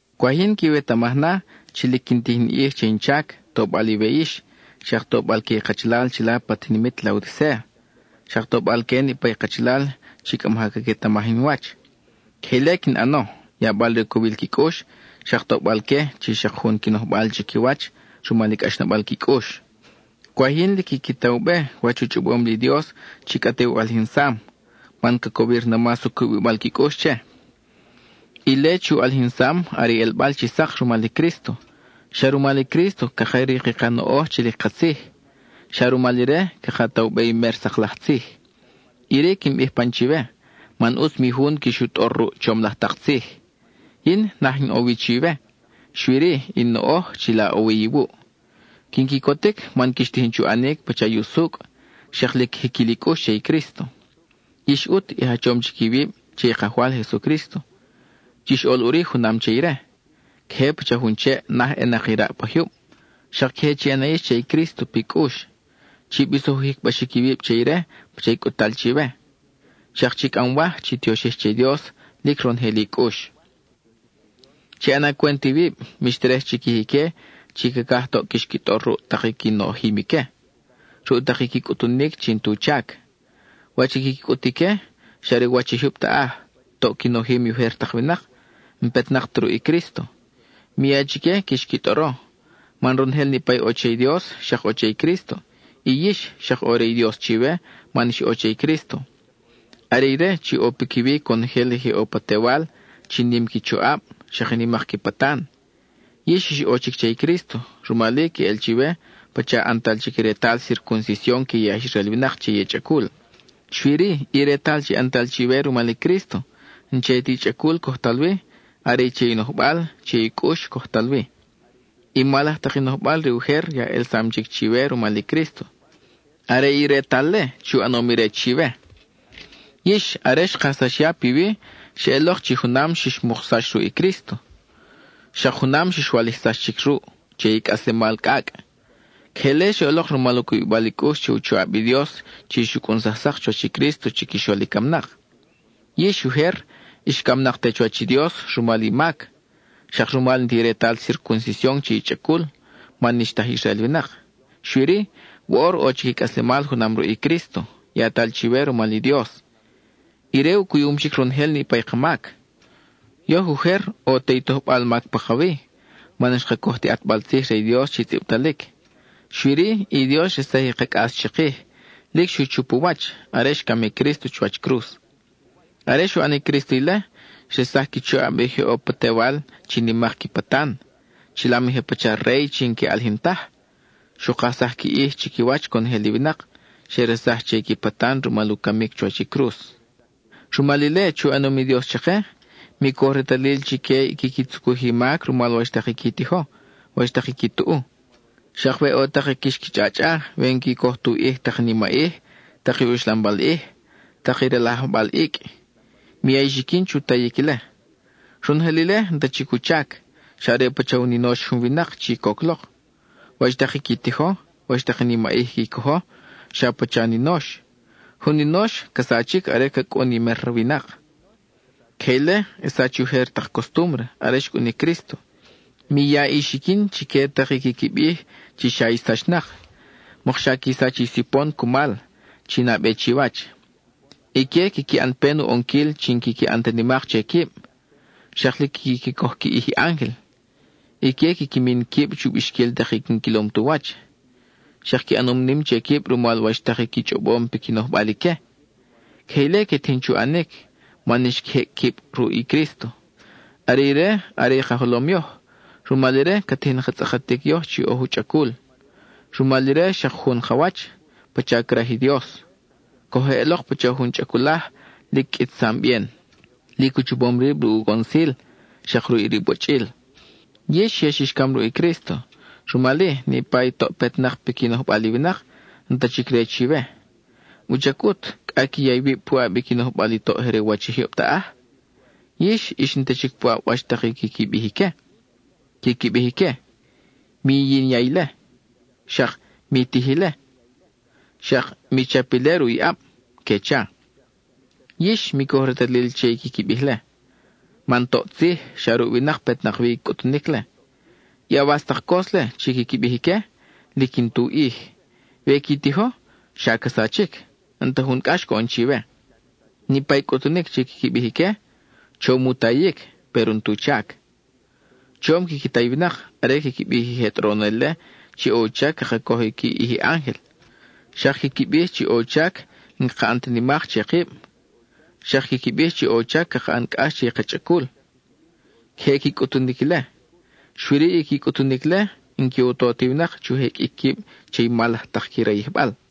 Cwaj yin quiwetamaj na chi lic quin tij in ʼij che in chac, tobal iwe yix, xak tobal que i kachalal chila pa tinimit Laodicéa, xak tobal que niʼpa i kachalal chi cʼa maja caquetamaj in wach. Queje ile quin ʼano, yabal re u cowil qui cʼux, xak tobal que chi xak jun qui nojbal chiquiwach rumal i cʼaxnabal qui cʼux. Cwaj yin lic quiqui ta u be wach u chʼobom li Dios chi cʼa te u ʼalijinsam, man ca cowir na mas u cubibal qui cʼux che. Ile chi u ʼalijinsam are i ʼelbal chi sak rumal i Crísto. Xa rumal i Crísto caka rik i ka noʼoj chi lic katzij; xa rumal ire caka ta u be i mer sak laj tzij. Iri quin bij pan chiwe, man ʼutz mi jun quix u tʼor ruʼ chom laj tak tzij. Yin, naj in ʼo wi chiwe, xui-ri in noʼoj chila ʼo wi iwuʼ. Quin quicotic man quix tijin chu ʼanic pacha i usucʼ, xak lic jiquil i cʼux che i Crísto. Yix ʼut, i jachom chic iwib che i Kajwal Jesucrísto; chix ʼol ʼuri junam che ire. Queje pacha jun cheʼ naj ʼenak i raʼ pa jyub, xak queje chi ʼana yix che i Crísto pi cʼux; chi bisoj u jicbaxic iwib che ire pacha i cʼut-tal chiwe, xak chi cʼamwaj chi tioxij che i Dios lic ronojel i cʼux. Chi ʼana cwent iwib, mix terej chiquij ique chi cacaj toʼ quix qui tʼor ruʼ tak i qui nojim ique, ruʼ tak i qui cʼutunic chi n-tu chac. Wach i quiqui cʼut ique, xa re u wach i jyub taʼaj, toʼ qui nojim i ujer tak winak, n-petnak ta ruʼ i Crísto. Mi ya chique quix qui tʼoro, man ronojel niʼpa i ʼo che i Dios xak ʼo che i Crísto, y yix, xak ʼo re i Dios chiwe man ix ʼo che i Crísto. Are ire chi ʼo piquiwi conojel i je ʼo pa tewal chi nim qui choʼab, xak i nimak qui patan. Yix ix ʼo chic che i Crísto, rumal-i queʼel chiwe pacha ʼantal chic i retal circuncision que i aj Israel winak che i chʼacul. Xui-ri, i retal chi ʼantal chiwe rumal i Crísto n-che ti chʼacul cojtal wi, are che i nojbal, che i cʼux, cojtal wi. I mal laj tak i nojbal re ujer ya ʼelsam chic chiwe rumal i Crísto. Are i retal-le chi u ʼanom ire chiwe. Yix, are xkajsax ya piwi, xeʼelok chi junam xix muksax ruʼ i Crísto, xak junam xix walijsax chic ruʼ che i cʼaslemal cʼacʼ. Queje ile xeʼelok rumal u cubibal i cʼux che u choʼab i Dios chi xu cʼunsaj sak chuwach i Crísto chiquixol i camnak. Yix, ujer, ix camnak te chuwach i Dios rumal i mac, xak rumal n-ti retal circuncision che i chʼacul, man n-ix ta aj Israel winak. Xui-ri, woʼor ʼo chic i cʼaslemal junam ruʼ i Crísto, yatal chiwe rumal i Dios. Ire u cuyum chic ronojel niʼpa i ka mac. Yoj ujer, ʼo te i tojbal mac pakawi, man n-xka coj ti ʼatbal tzij re i Dios chi tzʼibtalic; xui-ri, i Dios xresaj i ka cʼas chikij, lic xu chup u wach, are xcam i Crísto chuwach cruz. Are xu ʼan i Crísto ile, xresaj qui choʼab i je ʼo pa tewal chi nimak qui patan, chilam i je pacha rey chi n-que ʼalijin taj; xu kajsaj qui ʼij chiquiwach conojel i winak, xe resaj che i qui patan rumal u camic chuwach i cruz. Rumal ile chi u ʼanom i Dios chake, mi coj retalil chique i quiqui tzucuj i mac rumal wach tak i qui tijo, wach tak i qui tuʼu. Xak we ʼo tak i quix qui chʼachʼa we n-qui coj tu ʼij tak i nimaʼij, tak i uxlambal ʼij, tak i rajlajbal icʼ; mi ya i xiquin chu tayic ile. Ronojel ile n-ta chic u chac, xa are pacha u ninox jun winak chi coc lok. Wach tak i qui tijo, wach tak i nimaʼij qui cojo, xa pacha ninox; jun ninox ca sachic are ca cʼun i mer winak. Queje ile xsach i ujer tak costúmbre are xcʼun i Crísto. Mi ya i xiquin chique tak i quiqui bij chi xa ix sachnak; mokxa qui sach i sipon cumal, chi nabe chiwach. Ique quiqui ʼan pen u ʼonquil chi n-quiqui ʼan ta nimak che quib; xak lic quiqui coj qui ʼij i ángel. Ique quiqui min quib chu bixquil tak i n-quilom tu wach, xak qui ʼanom nim che quib rumal wach tak i qui chʼobom piqui nojbal ique. Queje ile que tijin chu ʼanic, man xqui jecʼ quib ruʼ i Crísto. Are ire are i ka jolom yoj; rumal ire, ca tijin ka tzʼakatic yoj chi oj u chʼacul. Rumal ire xak jun ka wach, pacha craj i Dios; coj eʼelok pacha jun chʼaculaj, lic qʼuitsam bien, lic u chapom rib ruʼ u gonsil, xak ruʼ i ribochʼil. Yix ya xix cam ruʼ i Crísto, rumal-i, niʼpa i toʼ petnak piqui nojbal i winak, n-ta chic re chiwe. ¿Wuchac ʼut, cʼa qui ya iwib puʼab i qui nojbal i toʼ je re u wach i jyub taʼaj? Yix, ix n-ta chic puʼab wach tak i quiqui bij ique. Quiqui bij ique: “Mi yinya ile,” xak “Mi tij ile,” xak “Mi chap ile ruʼ i ʼab,” que cha. Yix, mi coj retalil che i quiqui bij-le, man toʼ tzij, xa ruʼ winak petnak wi i cʼutunic-le. I awas tak cos-le chi quiqui bij ique, lic n-tu ʼij; we qui tijo, xa ca sachic, n-ta jun cʼax coʼon chiwe. Niʼpa i cʼutunic chi quiqui bij ique, chom u tayic, péro n-tu chac. Chom quiqui ta i winak are quiqui bij i je tʼoronel-le chi ʼo u chac caka coj qui ʼij i ángel; xak quiqui bij chi ʼo u chac n-caka ʼan ta nimak che kib; xak quiqui bij chi ʼo u chac caka ʼan cʼax che i ka chʼacul. Queje qui cʼutunic ile, xui-ri, i qui cʼutunic-le n-que u to ti winak chu jeqʼuic quib che i mal laj tak qui rayijbal.